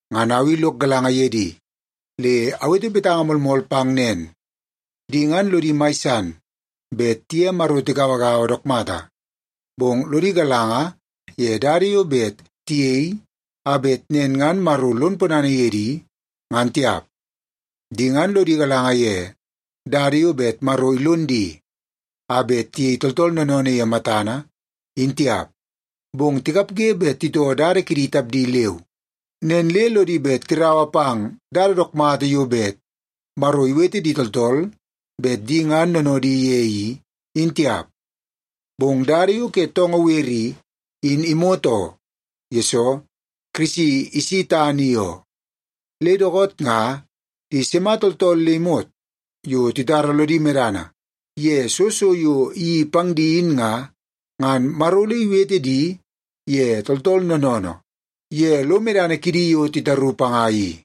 Ngan au i lok galanga ye di, le awete betanga moolmool pang nen, di ngan lodi mai san bet tiye Maro tigauagaua dook mata, bong lodi galanga ye dada yo bet tiyei a bet nen ngan Maro lon ponana ye di, ngan tiap. Di ngan lodi galanga ye dada yo bet Maro ilon di a bet tiyei tooltool noonoonoo ye matana, in tiap. Bong tikapge bet titoo dada kidi tapdi leu, nen le lodi bet tiraua pang dada dook mata yo bet Maro iwete di tooltool bet di ngan noonoodi ye i, in tiap. Bong dada yo ke toongoo wer i, in imot, yesoo Kirisi isi tana i oo. Le dookoot nga, di sima tooltool le imot yo titara lodi medana ye soo so yo iyeii pang di in nga, ngan Maro ole iwete di ye tooltool noonoonoo ye lo medana kidi yo titaru panga i.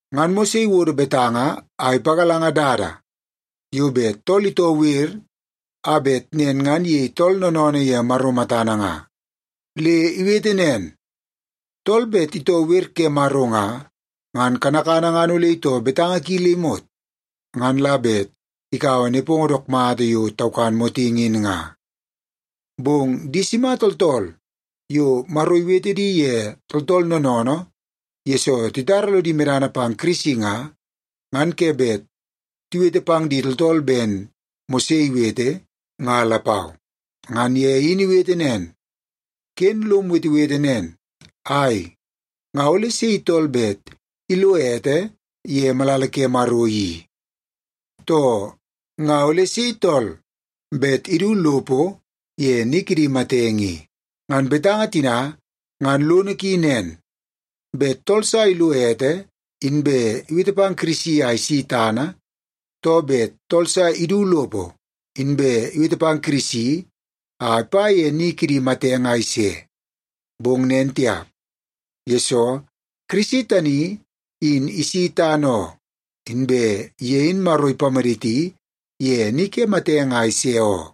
Ngan Mose iwodo betanga a ipagalanga dada yo bet tool itoo wer a bet nen ngan iyei tool noonoonoo ye Maro matana nga. Le iwete nen, “Tool bet itoo wer ke Maro nga, ngan kanakana ngan ole itoo betanga ki le imot, ngan la bet ikaua nepongo dook mata yo taukan motingi in nga.” Bong di sima tooltool yo Maro iwete di ye tooltool noonoonoo yesoo titara lodi medana pang Kirisi nga, ngan ke bet tiwete pang di tooltool ben Mose iwete, nga lapau. Ngan ye in iwete nen, “Ken lom wetewete nen, ‘Ai, nga ole sei tool bet ilo ete ye malala ke Maro i?’ too, ‘Nga ole sei tool bet idu lopo ye ni kidi matenge i?’” (Ngan betanga tina ngan lono ki nen: Bet tool sa ilo ete inbe iwete pang Kirisi a isi tana, too bet tool sa idu lopo inbe iwete pang Kirisi a ipa ye ni kidi matenge a ise. Bong nen tiap, yesoo Kirisi tani in isi tana oo, inbe ye in Maro ipamaditi ye ni ke matenge a ise oo.)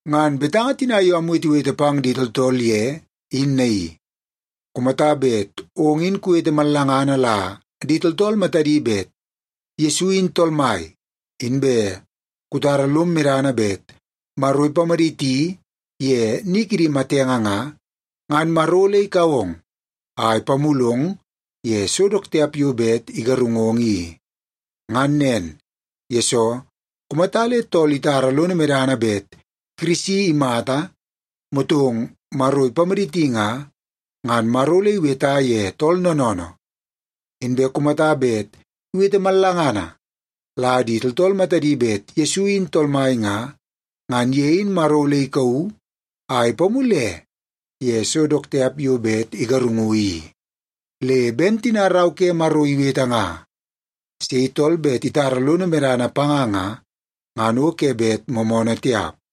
Ngan betanga tina yo amwetewete pang di tooltool ye in naii; kumata bet ong in kuwete mallangana la di tooltool matadi bet Yesu in Tool Mai, inbe kutara lom medana bet Maro ipamaditi ye ni kidi matenge nga, ngan Maro ole ikau ong a ipamulong ye so dook tiap yo bet igarungong i. Ngan nen, yesoo kumata le tool itara lono medana bet Kirisi imata motong Maro ipamaditi nga, ngan Maro ole iweta ye tool noonoonoo. Inbe kumata bet iwete mallangana la di tooltool matadi bet Yesu in Tool Mai nga, ngan ye in Maro ole ikauu a ipamule ye so dook tiap yo bet igarungu i. Le ben tina Rau ke Maro iwete nga, “Sei tool bet itara lono medana panga nga, ngan o ke bet moomoonoo tiap.”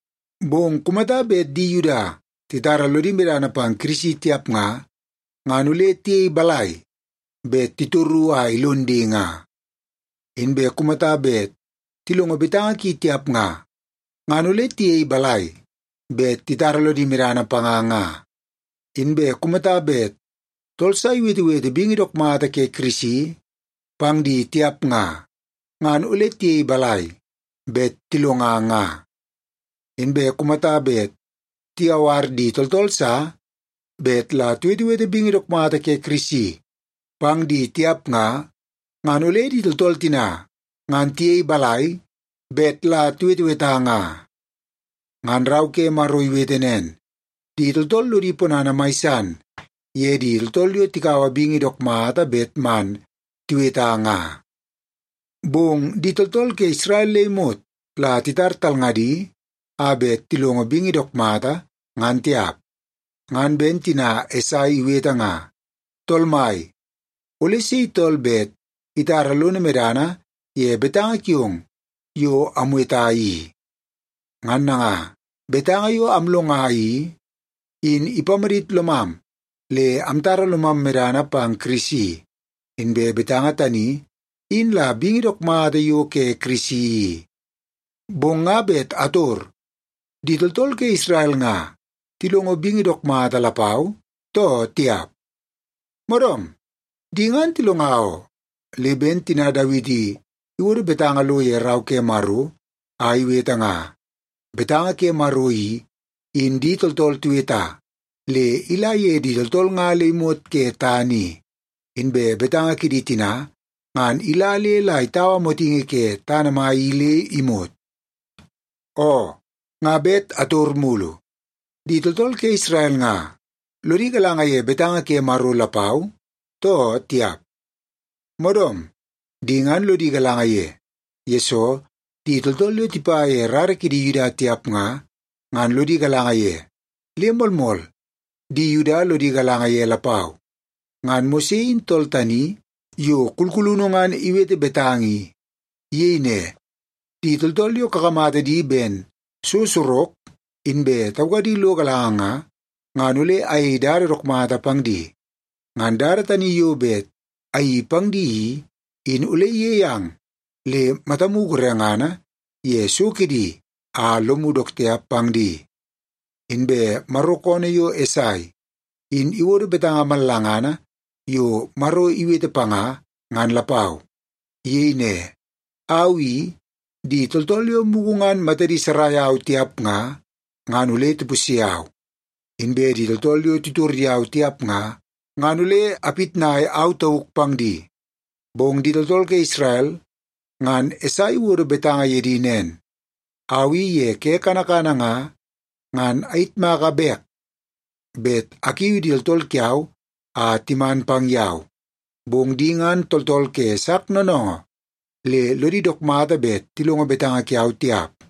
Bong kumata bet di Yuda titara lodi medana pang Kirisi tiap nga, ngan ole tiyei balai bet titoru a ilon di nga? Inbe kumata bet tilongo betanga ki tiap nga, ngan ole tiyei balai bet titara lodi medana panga nga? Inbe kumata bet tool sa iwetewete bingi dook mata ke Kirisi pang di tiap nga, ngan ole tiyei balai bet tilonga nga? Inbe kumata bet tiyawar di tooltool sa bet la tiwetewete bingi dook mata ke Kirisi pang di tiap nga, ngan ole di tooltool tina ngan tiyei balai bet la tiweteweta nga? Ngan Rau ke Maro iwete nen, “Di tooltool lodi ponana mai san ye di tooltool yo tikaua bingi dook mata bet man tiweta nga.” Bong di tooltool ke Isrel le imot la titar talngadi a bet tilongo bingi dook mata, ngan tiap. Ngan ben tina Esai iwete nga, “Tool Mai, ole sei tool bet itara lono medana ye betanga kiong yo amweta i?” Ngan nanga, betanga yo amlonga i, in ipamadit lomam le amtara lomam medana pang Kirisi. Inbe betanga tani, in la bingi dook mata yo ke Kirisi i. Bong nga bet ator: Di tooltool ke Isrel nga tilongo bingi dook mata lapau, too tiap? Moodoom, di ngan tilonga oo. Le ben tina Dawiti iwodo betanga lo ye Rau ke Maro a iwete nga, “Betanga ke Maro i, in di tooltool tiweta, le ila ye di tooltool nga le imot ke tana i, inbe betanga kidi tina, ngan ila le la itaua motingi ke tana mai i le imot.” Oo, nga bet ator mulu: Di tooltool ke Isrel nga lodi galanga ye betanga ke Maro lapau, too tiap? Moodoom, di ngan lodi galanga ye, yesoo di tooltool yo tipa ye rara kidi Yuda tiap nga, ngan lodi galanga ye, le moolmool, di Yuda lodi galanga ye lapau. Ngan Mose in tool tani yo kulkulunu ngan iwete betanga i. Iyei ne, “Di tooltool yo kakamata di ben so sorok inbe taukadi lo galanga nga, ngan ole ayei dada dook mata pang di. Ngan dada tani yo bet ayeii pang di i, in ole iyei ang le matamu gorengana ye so kidi a lomu dook tiap pang di.” Inbe Maro koonoo yo Esai in iwodo betanga mallangana yo Maro iwete panga, ngan lapau. Iyei ne, “Au i, di tooltool yo mugu ngan matadi sarai au tiap nga, ngan ole tipusye au. Inbe di tooltool yo titor yau tiap nga, ngan ole apitnai au tauk pang di.” Bong di tooltool ke Isrel ngan Esai iwodo betanga ye di nen, “Au i ye ke kanakana nga, ngan ayitmaka bek bet akiu di tooltool kiau a timan pang yau, bong di ngan tooltool ke sak noonoongoo le lodi dook mata bet tilongo betanga kiau tiap.”